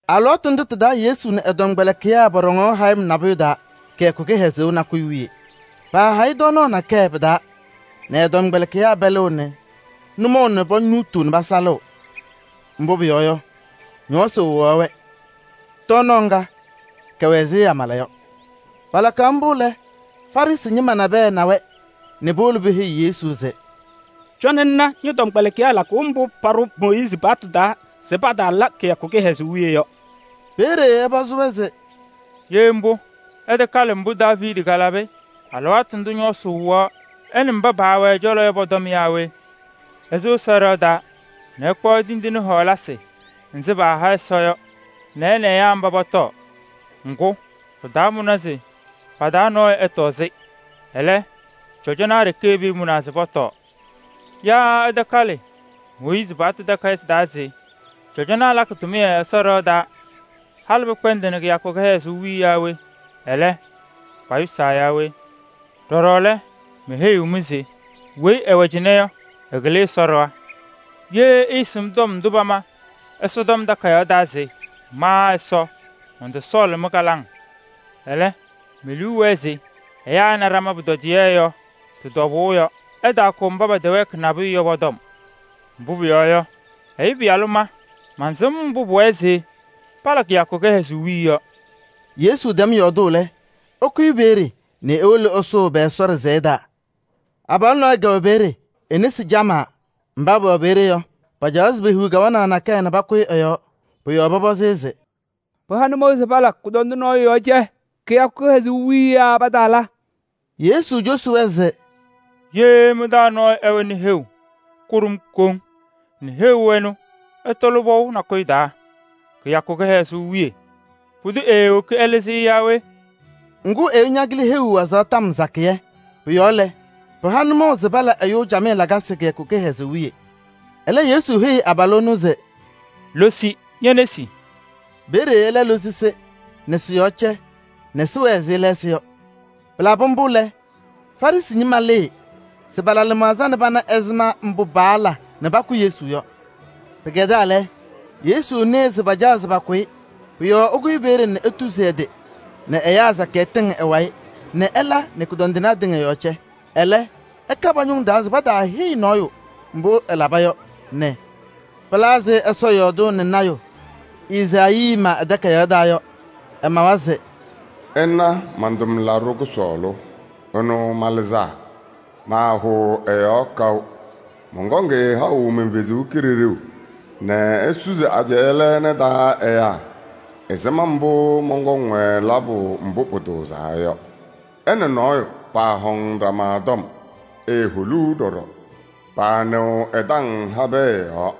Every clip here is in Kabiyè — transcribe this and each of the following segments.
Alɩwaatʋ ndʋ tɩ-taa Yesu nɛ ɛ-tɔmkpɛlɩkɩyaa pɔɖɔŋaɣ hayɩm nabʋyʋ taa kɩyakʋ kɩhɛzʋʋ nakʋyʋ wiye. Paahayɩ tɔɔnaɣ nakɛyɛ pɩ-taa nɛ ɛ-tɔmkpɛlɩkɩyaa pɛlɩɣ nɛ nʋmɔʋ nɛ ponuutuu nɛ pasalɩɣ, mbʋ pʋyɔɔ yɔ, ñɔɔsɩ wɩɣaɣ-wɛ. Tɔɔnaɣ ŋga, kɛwɛ ɛzɩ amala yɔ. Palakaɣ mbʋ lɛ, Farɩsɩ ñɩma nabɛyɛ na-wɛ nɛ powolo peheyi Yesu se: “Cɔnɩ ŋna ñɔ-tɔmkpɛlɩkɩyaa lakʋʋ mbʋ paɖʋ Mooyiizi paɣtʋ taa se pataala kɩyakʋ kɩhɛzʋʋ wiye yɔ.” Peeye ɛpɔzɩ-wɛ se: “Ye mbʋ, ɩtakalɩ mbʋ Daaviidi kalabɩ alɩwaatʋ ndʋ ñɔɔsɩ wɩɣaɣ ɛ nɛ mba paawɛ ɛ-cɔlɔ yɔ pʋ-tɔm naa we? Ɛsʋ Ɛsɔ ɖɩɣa taa nɛ ɛkpaɣ tindine wena paaha Ɛsɔ yɔ nɛ ɛ nɛ ɛyaa mba pɔtɔɔ. Ŋgʋ, pɩtaamʋnɩ se pa-taa nɔɔyʋ ɛtɔɔ-yɛ. Ɛlɛ, cɔjɔnaa ɖeke pɩɩmʋnaa se pɔtɔɔ. Yaa ɩtakalɩ Mooyiizi paɣtʋ takayɩsɩ taa se: cɔjɔnaa lakɩ tʋmɩyɛ Ɛsɔ ɖɩɣa taa halɩ pɩkpɛndɩnɩ kɩyakʋ kɩhɛzʋʋ wiye yaa we? Ɛlɛ, payʋsaa yaa we? Pʋcɔ, meheyiɣ-mɩ se weyi ɛwɛ cɩnɛ yɔ, ɛkɩlɩ Ɛsɔ ɖɩɣa. Ye ɩɩsɩm tɔm ndʋ pama Ɛsɔtɔm Takayaɣ taa se: ‘Ma Ɛsɔ mɔntɔsɔɔlɩ mɩ-kɩlaŋ. Ɛlɛ, me-liu wɛɛ se ɛyaa ɛna ɖama pʋtɔdɩyɛ’ yɔ tɩ-tɔbʋʋ yɔ, ɩtaakʋ mba pɛtɛwɛɛkɩ nabʋyʋ yɔ pɔ-tɔm. Mbʋ pʋyɔɔ yɔ, Ɛyʋ Pɩyalʋ ma mansɩm mbʋ pʋwɛɛ se pala kɩyakʋ kɩhɛzʋʋ wiye yɔ.” Yesu tɛm yɔɔdʋʋ lɛ, ɛkʋyɩ peeye nɛ ewolo ɛsʋʋ pɛ-Ɛsɔ ɖɩsɛyɛ taa. Abalʋ nɔɔyʋ kɛwɛ peeye, e-nesi camaa. Mba pɛwɛ peeye yɔ, pacaɣaɣ se pehiɣ kawanaɣ nakɛyɛ nɛ pakʋyɩ ɛ-yɔɔ. Pʋ-yɔɔ pɔpɔzɩ-ɩ se: “Pɩha nʋmɔʋ se pala nɛ kʋdɔndʋ nɔɔyʋ yɔɔ cɛ kɩyakʋ kɩhɛzʋʋ wiye yaa pataala?” Yesu cosi-wɛ se: “Ye mɩ-taa nɔɔyʋ ɛwɛnɩ heu kʋɖʋm koŋ nɛ heu ɛnʋ ɛtɔlɩ pɔʋ nakʋyʋ taa kɩyakʋ kɩhɛzʋʋ wiye, pʋdʋ eewoki ɛlɩzɩ-ɩ yaa we?” Ŋgʋ, ɛyʋ ñakɩlɩ heu wazaɣ tɔm sakɩyɛ. Pʋ-yɔɔ lɛ, pɩha nʋmɔʋ se pala ɛyʋ camɩyɛ lakasɩ kɩyakʋ kɩhɛzʋʋ wiye. Ɛlɛ Yesu heyi abalʋ ɛnʋ se: “Losi ñe-nesi!” Peeye ɛlɛ losi-sɩ nɛ sɩ-yɔɔ cɛ nɛ sɩwɛɛ ɛzɩ lɛɛsɩ yɔ. Pɩlabɩ mbʋ lɛ, Farɩsɩ ñɩma lɩɩ se pala lɩmaɣza nɛ pana ɛzɩma mbʋ paala nɛ pakʋ Yesu yɔ. Pɩkɛdaa lɛ, Yesu nɩɩ se pacaɣ pakʋ-ɩ. Pʋ-yɔɔ ɛkʋyɩ peeye nɛ etuzi ɛ-tɩ nɛ ɛyaa sakɩyɛ tɩŋ ɛ-wayɩ nɛ ɛla nɛ kʋdɔndɩnaa tɩŋa yɔɔ cɛ. Ɛlɛ, ɛka pa-ñʋŋ taa se pataaheyi nɔɔyʋ mbʋ ɛlaba yɔ nɛ pɩla ɛzɩ Ɛsɔ yɔɔdʋʋ nɛ lɔɔyaɣ tʋ Ezaayii ma ɛ-takayaɣ taa yɔ. Ɛmawa se: “Ɩna man-tʋmlaɖʋ kʋsɔɔlʋ. Ɛnʋ malɩzaa. Maahʋʋ ɛ-yɔɔ kaʋ. Mɔnkɔŋ-ɩ haʋ man-Kalɩzaɣ nɛ esusi ajɛɛ lɛɛna taa ɛyaa ɛzɩma mbʋ mɔnkɔŋ-wɛ labʋ mbʋ pʋtʋʋzaa yɔ. Ɛ nɛ nɔɔyʋ paahɔŋnɩ ɖama tɔm, eeholuu ɖɔɖɔ. Paanɩɣ ɛ-taŋ habɛɛ yɔɔ.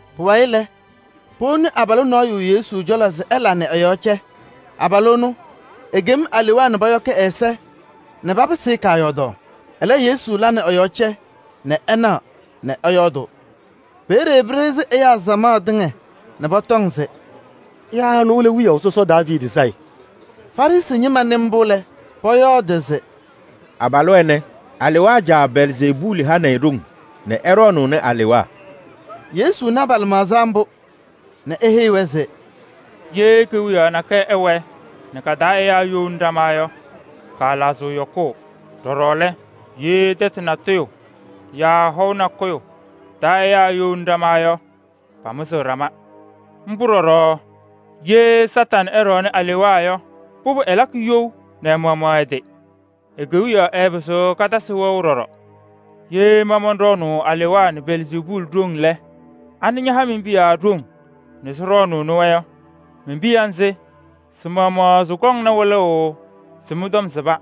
Pʋwayɩ lɛ, powoni abalʋ nɔɔyʋ Yesu cɔlɔ se ɛla nɛ ɛ-yɔɔ cɛ. Abalʋ ɛnʋ, ekem alewaa nɛ pɔyɔkɩ ɛ-ɛza nɛ papɩsɩ-ɩ kaayɔɔdaɣ. Ɛlɛ Yesu la nɛ ɛ-yɔɔ cɛ nɛ ɛnaɣ nɛ ɛyɔɔdʋʋ. Peeye pɩɖɩɣzɩ ɛyaa samaɣ tɩŋa nɛ pɔtɔŋ se: “Yaa ɛnʋ lɛ wiyaʋ sɔsɔ Daaviidi Sayɩ?” Farɩsɩ ñɩma nɩ mbʋ lɛ, pɔyɔɔdɩ se: “Abalʋ ɛnɛ, alewaa caa Belzeebuuli hanɩ-ɩ ɖoŋ nɛ ɛɖɔɔnʋʋnɩ alewaa.” Yesu na pa-lɩmaɣza mbʋ nɛ eheyi-wɛ se: “Ye kewiyaɣ nakɛyɛ ɛwɛɛ nɛ ka-taa ɛyaa eyouni ɖama yɔ, kaalaɣzɩɣ yɔkʋʋ. Ɖɔɖɔ lɛ, ye tɛtʋ natʋyʋ yaa hɔʋ nakʋyʋ taa ɛyaa eyouni ɖama yɔ, pamɩzɩɣ ɖama. Mbʋ ɖɔɖɔ ye Kañadʋ Satanɩ ɛɖɔɔnʋʋ alewaa yɔ, pʋbʋ ɛlakɩ you nɛ ɛ-maɣmaɣ ɛ-tɩ. E-kewiyaɣ ɛɛpɩzɩɣ katasɩ wɛʋ ɖɔɖɔ. Ye ma mɔnɖɔɔnʋʋ alewaa nɛ Belzeebuuli ɖoŋ lɛ, anɩ ñaha mi-piya ɖoŋ nɛ sɩɖɔɔnʋʋnɩ-wɛ yɔ? Mi-piya nzɩ, sɩ-maɣmaɣ sɩkɔŋna wɩlʋʋ se mɩ-tɔm sɩba.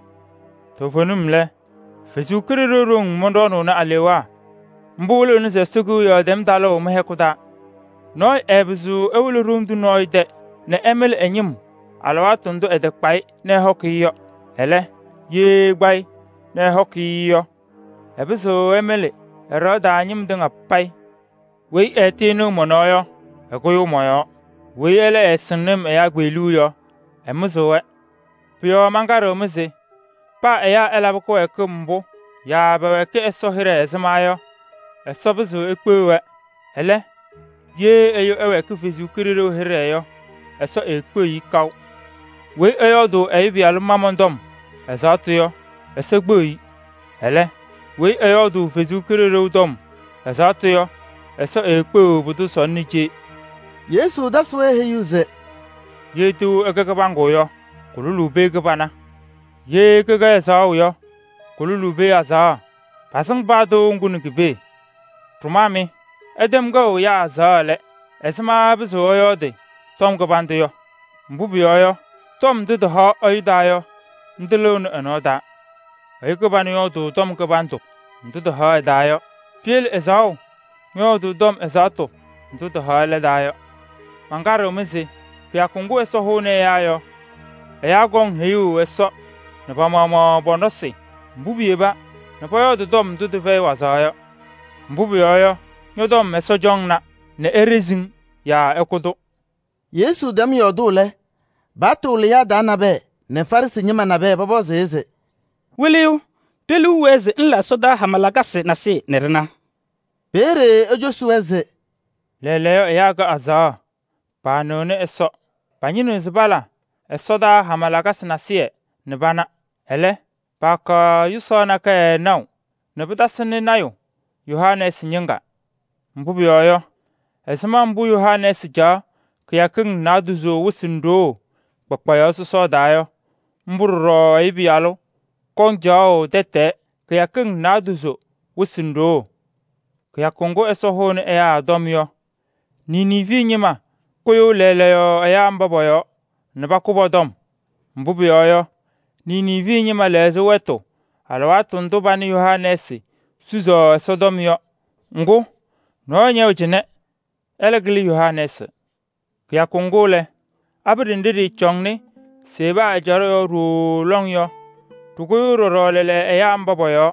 Toovenim lɛ, Ɛsɔ Kalɩzaɣ ɖoŋ mɔnɖɔɔnʋʋnɩ alewaa. Mbʋ wɩlɩɣna se Ɛsɔ Kewiyaɣ tɛm talʋʋ mɩ-hɛkʋ taa. “Nɔɔyʋ ɛɛpɩzɩɣ ewolo ɖoŋ tʋ nɔɔyʋ tɛ nɛ ɛmɩlɩ ɛ-ñɩm alɩwaatʋ ndʋ ɛtakpa-ɩ nɛ ɛhɔkɩ-ɩ yɔ. Ɛlɛ, ye ɛkpa-ɩ nɛ ɛhɔkɩ-ɩ yɔ, ɛpɩzɩɣ ɛmɩlɩ ɛ-ɖɩɣa taa ñɩm tɩŋa payɩ. “Weyi ɛɛtɩnɩɣ mɔ-yɔɔ yɔ, ɛkʋyʋʋ mɔ-yɔɔ. Weyi ɛlɛ ɛɛsɩŋnɩ-m ɛyaa kpeɣluu yɔ, ɛmɩzɩɣ-wɛ. Pʋ-yɔɔ mankaɖɩɣ-mɩ se paa ɛyaa ɛlabɩ kɩwɛɛkɩm mbʋ yaa pɛwɛɛkɩ Ɛsɔ hɩɖɛ ɛzɩma yɔ, Ɛsɔ pɩzɩɣ ekpeɣ-wɛ. Ɛlɛ, ye ɛyʋ ɛwɛɛkɩ Ɛsɔ Kalɩzaɣ hɩɖɛ yɔ, Ɛsɔ eekpeɣiɣ-i kaʋ. Weyi ɛyɔɔdʋʋ Ɛyʋ Pɩyalʋ ma tɔm ɛzaɣtʋ yɔ, Ɛsɔ kpeɣiɣ-i. Ɛlɛ, weyi ɛyɔɔdʋʋ Ɛsɔ Kalɩzaɣ tɔm ɛzaɣtʋ yɔ, Ɛsɔ eekpeɣiɣ pʋdʋ sɔnɔ nɛ cee.” Yesu tasɩ-wɛ heyuu se: “Ye tɩʋ ɛkɛ kɩbaŋgʋ yɔ, kʋlʋlʋʋ pee kɩbana. Ye kɩkɛ ɛzaɣʋ yɔ, kʋlʋlʋʋ pee azaɣa: pasɩŋ paa tɩʋ ŋgʋ nɛ ki-pee. Ɖʋmaa mɩ! Ɩtɛm kɛʋ ɛyaa azaɣa lɛ, ɛzɩma ɩpɩzɩɣ ɩyɔɔdɩ tɔm kɩbandʋ yɔ? Mbʋ pʋyɔɔ yɔ, tɔm ndʋ tɩhaɣ ɛyʋ taa yɔ, ndʋ lɩɣnɩ ɛ-nɔɔ taa. Ɛyʋ kɩbanʋ yɔɔdʋʋ tɔm kɩbandʋ ndʋ tɩhaɣ ɛ-taa yɔ. Piyele ɛzaɣʋ ñɔyɔɔdʋʋ tɔm ɛzaɣtʋ ndʋ tɩhaɣ ɛlɛ taa yɔ. Mankaɖɩɣ-mɩ se kɩyakʋ ŋgʋ Ɛsɔ hʋʋnɩ ɛyaa yɔ, ɛyaa kɔŋ heyuu Ɛsɔ nɛ pa-maɣmaɣ pɔ-nɔsɩ mbʋ piyeba nɛ pɔyɔɔdɩ tɔm ndʋ tɩfɛyɩ wazaɣ yɔ. Mbʋ pʋyɔɔ yɔ, ñɔ-tɔm Ɛsɔ cɔŋna nɛ eɖezi-ŋ yaa ɛkʋ-tʋ.” Yesu tɛm yɔɔdʋʋ lɛ, paɣtʋ wɩlɩyaa taa nabɛyɛ nɛ Farɩsɩ ñɩma nabɛyɛ pɔpɔzɩ-ɩ se: “Wɩlɩyʋ! Ɖe-liu wɛɛ se ŋla ɛsɔdaa hama lakasɩ nasɩyɩ nɛ ɖɩna.” Peeye ecosi-wɛ se: “Lɛɛlɛɛyɔ ɛyaa kɛ azaɣa, paanɩɣnɩ Ɛsɔ. Pañɩnɩɣ se pala ɛsɔdaa hama lakasɩ nasɩyɩ nɛ pana. Ɛlɛ, paakaɣ yʋsaɣ nakɛyɛ naʋ nɛ pɩtasɩnɩ lɔɔyaɣ tʋ Yoonaasɩ ñɩŋga. Mbʋ pʋyɔɔ yɔ, ɛzɩma mbʋ Yoonaasɩ caɣ kɩyakɩŋ naadozo wɩsɩ nɛ ɖoo kpakpayaɣ sɔsɔɔ taa yɔ, mbʋ ɖɔɖɔ Ɛyʋ Pɩyalʋ kɔŋ caɣʋ tɛtɛɛ kɩyakɩŋ naadozo wɩsɩ nɛ ɖoo. Kɩyakʋ ŋgʋ Ɛsɔ hʋʋnɩ ɛyaa yɔ, Niniivi ñɩma kʋyʋʋ lɛɛlɛɛyɔ ɛyaa mba pɔ-yɔɔ nɛ pakʋ pɔ-tɔm. Mbʋ pʋyɔɔ yɔ, Niniivi ñɩma lɛɣzɩ wɛtʋ alɩwaatʋ ndʋ panɩ Yoonaasɩ susi Ɛsɔtɔm yɔ. Ŋgʋ, nɔɔyʋ ñɛwɛ cɩnɛ, ɛlɛ kɩlɩ Yoonaasɩ! Kɩyakʋ ŋgʋ lɛ, abiɖe nɖɩ ɖɩɩcɔnɩ Seba ɛjaɖɛ yɔɔ ɖooo lɔŋ yɔ, ɖɩkʋyʋʋ ɖɔɖɔ lɛɛlɛɛyɔ ɛyaa mba pɔ-yɔɔ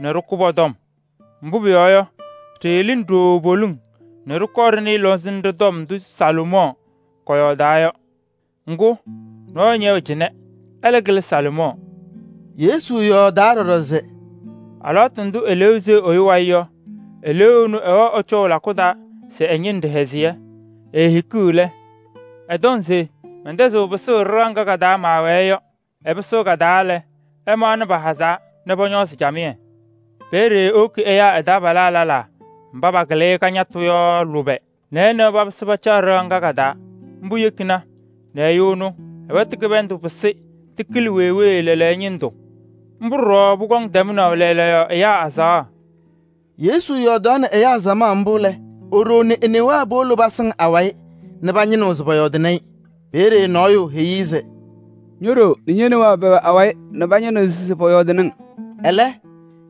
nɛ ɖɩkʋ pɔ-tɔm. Mbʋ pʋyɔɔ yɔ, ɖɩɩlɩnɩ ɖooo poliŋ nɛ ɖɩkɔɔ ɖɩnɩɩ lɔŋsɩnɖɛ tɔm ndʋ Salomɔɔ kɔyɔɔdaɣ yɔ. Ŋgʋ, nɔɔyʋ ñɛwɛ cɩnɛ, ɛlɛ kɩlɩ Salomɔɔ!” Yesu yɔɔdaa ɖɔɖɔ se: “Alɩwaatʋ ndʋ eleeu seɣ ɛyʋ wayɩ yɔ, eleeu ɛnʋ ɛwɛɣ ɛcɔʋ lakʋ taa se ɛñɩnɩ ɖɩhɛzɩyɛ. Eehikiɣ lɛ, ɛtɔŋ se: ‘Mɛntɛzɩɣ pɩsʋʋ ɖɩɣa ŋga ka-taa maawɛɛ yɔ.’ Ɛpɩsɩɣ ka-taa lɛ, ɛmaɣnɩ pahazaa nɛ pɔñɔɔzɩ camɩyɛ. Peeye ewoki ɛyaa ɛ-taabalaa lɛlaa mba pakɩlɩ-ɩ kañatʋ yɔ lʋbɛ nɛ ɛ nɛ wɛ papɩsɩ pacaɣ ɖɩɣa ŋga ka-taa. Mbʋ yekina nɛ ɛyʋ ɛnʋ ɛ-wɛtʋ kɩbɩndʋ pɩsɩ tɩkɩlɩ wee wee lɛɛlɛɛyɔ ñɩndʋ. Mbʋ ɖɔɖɔ pʋkɔŋ tɛmnaʋ lɛɛlɛɛyɔ ɛyaa azaɣa.” Yesu yɔɔdaɣnɩ ɛyaa samaɣ mbʋ lɛ, e-ɖoo nɛ e-newaa powolo pasɩŋ awayɩ nɛ pañɩnɩɣ se pɔyɔɔdɩnɩ-ɩ. Peeye nɔɔyʋ heyi-i se: “Ño-ɖoo nɛ ñe-newaa pɛwɛ awayɩ nɛ pañɩnɩɣ se pɔyɔɔdɩnɩ-ŋ.” Ɛlɛ,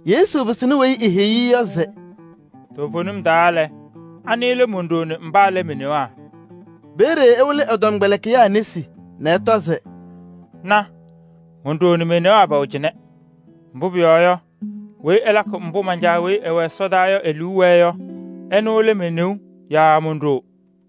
Yesu pɩsɩnɩ weyi eheyi-i yɔ se: “Toovenim taa lɛ, anɩ lɛ mon-ɖoo nɛ mba lɛ me-newaa?” Peeye ɛwɩlɩ ɛ-tɔmkpɛlɩkɩyaa nesi nɛ ɛtɔ se: “Na! Mon-ɖoo nɛ me-newaa pɛwɛnɩ cɩnɛ. Mbʋ pʋyɔɔ yɔ, weyi ɛlakɩ mbʋ man-Caa weyi ɛwɛ ɛsɔdaa yɔ e-liu wɛɛ yɔ, ɛnʋ lɛ me-neu yaa mon-ɖoo.”